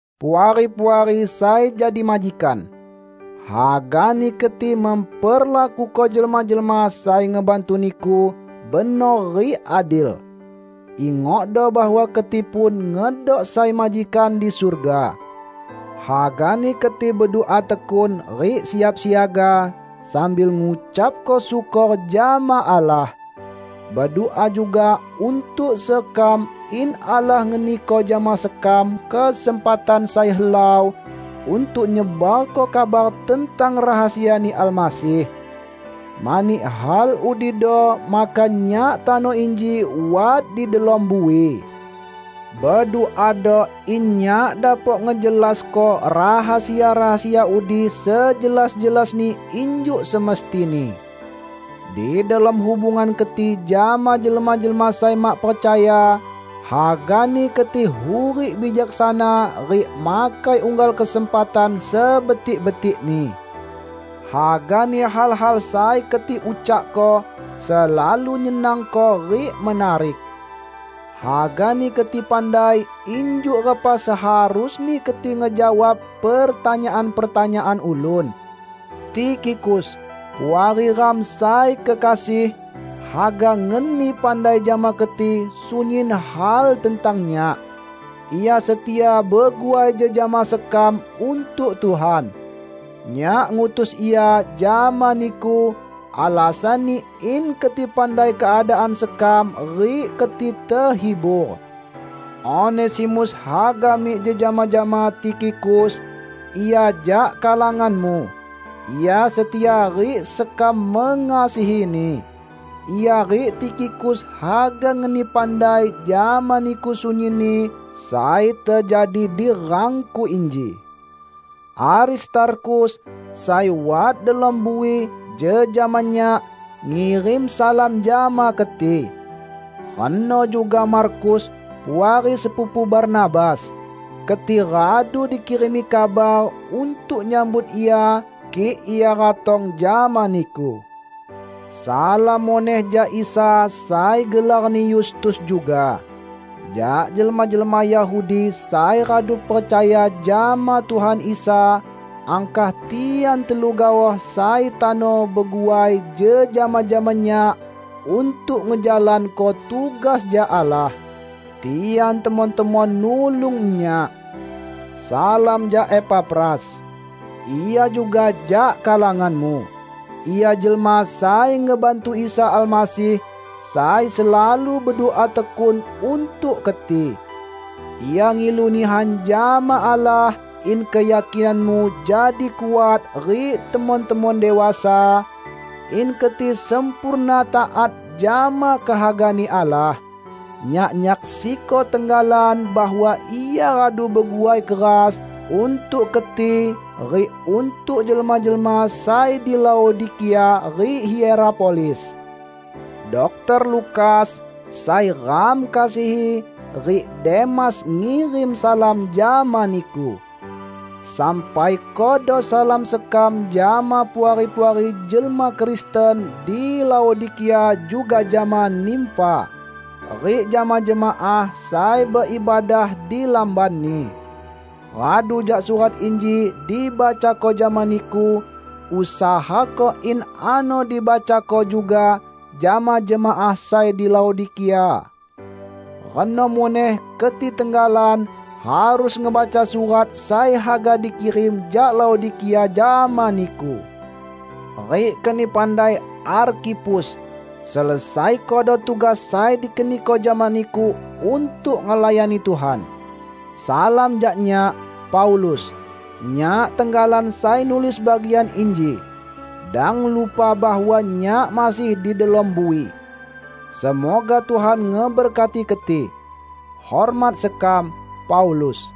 Puari-puari sai jadi majikan! Hagani keti memperlakuko jelma-jelma sai ngebantu niku benor rik adil. Ingokdo bahwa keti pun ngedok sai majikan di surga. Hagani keti bedua tekun rik siap siaga, sambil ngucapko syukor jama Allah. Bedua juga untuk sekam in Allah ngeniko jama sekam kesempatan sai helau untuk nyebarko kabar tentang rahasia-Ni Almasih. Mani hal udido maka nyak tano inji wat di delom bui. Beduado in nyak dapok ngejelasko rahasia-rahasia udi sejelas-jelasni injuk semestini. Di delom hubungan keti jama jelma-jelma sai mak percaya, hagani keti hurik bijaksana rik makai unggal kesempatan sebetik-betikni. Hagani hal-hal sai keti ucakko selalu nyenangko rik menarik. Hagani keti pandai injuk repa seharusni keti ngejawab pertanyaan-pertanyaan ulun. Tikhikus, puari ram sai kekasih, haga ngeni pandai jama keti sunyin hal tentang nyak. Ia setia beguai jejama sekam untuk Tuhan. Nyak ngutus ia jama niku alasanni in keti pandai keadaan sekam rik keti tehibur. Onesimus haga mik jejama jama Tikhikus; ia jak kalanganmu. Ia setia rik sekam mengasihini. Ia rik Tikhikus haga ngeni pandai jama niku sunyinni sai tejadi di rangku inji. Aristarkhus, sai wat delom bui jejama nyak, ngirim salam jama keti. Reno juga Markus, puari sepupu Barnabas. (Keti radu dikirimi kabar untuk nyambut ia kik ia ratong jama niku.) Salam muneh jak Isa sai gelarni Yustus juga. Jak jelma-jelma Yahudi sai radu percaya jama Tuhan Isa, angkah tian telu gaoh sai tano beguai jejama jama nyak untuk ngejalanko tugas jak Allah. Tian temon-temon nulung nyak. Salam jak Epafras. Ia juga jak kalanganmu. Ia jelma sai ngebantu Isa Almasih, sai selalu bedua tekun untuk keti. Ia ngilu nihan jama Allah in keyakinanmu jadi kuat rik temon-temon dewasa, in keti sempurna taat jama kehaga-Ni Allah. Nyak nyaksiko tenggalan bahwa ia radu beguai keras untuk keti rik untuk jelma-jelma sai di Laodikia rik Hierapolis. Dokter Lukas, sai ram kasihi, rik Demas ngirim salam jama niku. Sampaikodo salam sekam jama puari-puari jelma Kristen di Laodikia; juga jama Nimfa, rik jama jemaah sai beibadah di lambanni. Radu jak surat inji dibacako jama niku, usahako in ano dibacako juga jama jemaah sai di Laodikia. Reno muneh keti tenggalan harus ngebaca surat sai haga dikirim jak Laodikia jama niku. Rik keni pandai Arkhipus, "Selesaikodo tugas sai dikeniko jama niku untuk ngelayani Tuhan." Salam jak nyak, Paulus. Nyak tenggalan sai nulis bagian inji. Dang lupa bahwa nyak masih di delom bui! Semoga Tuhan ngeberkati keti. Hormat sekam, Paulus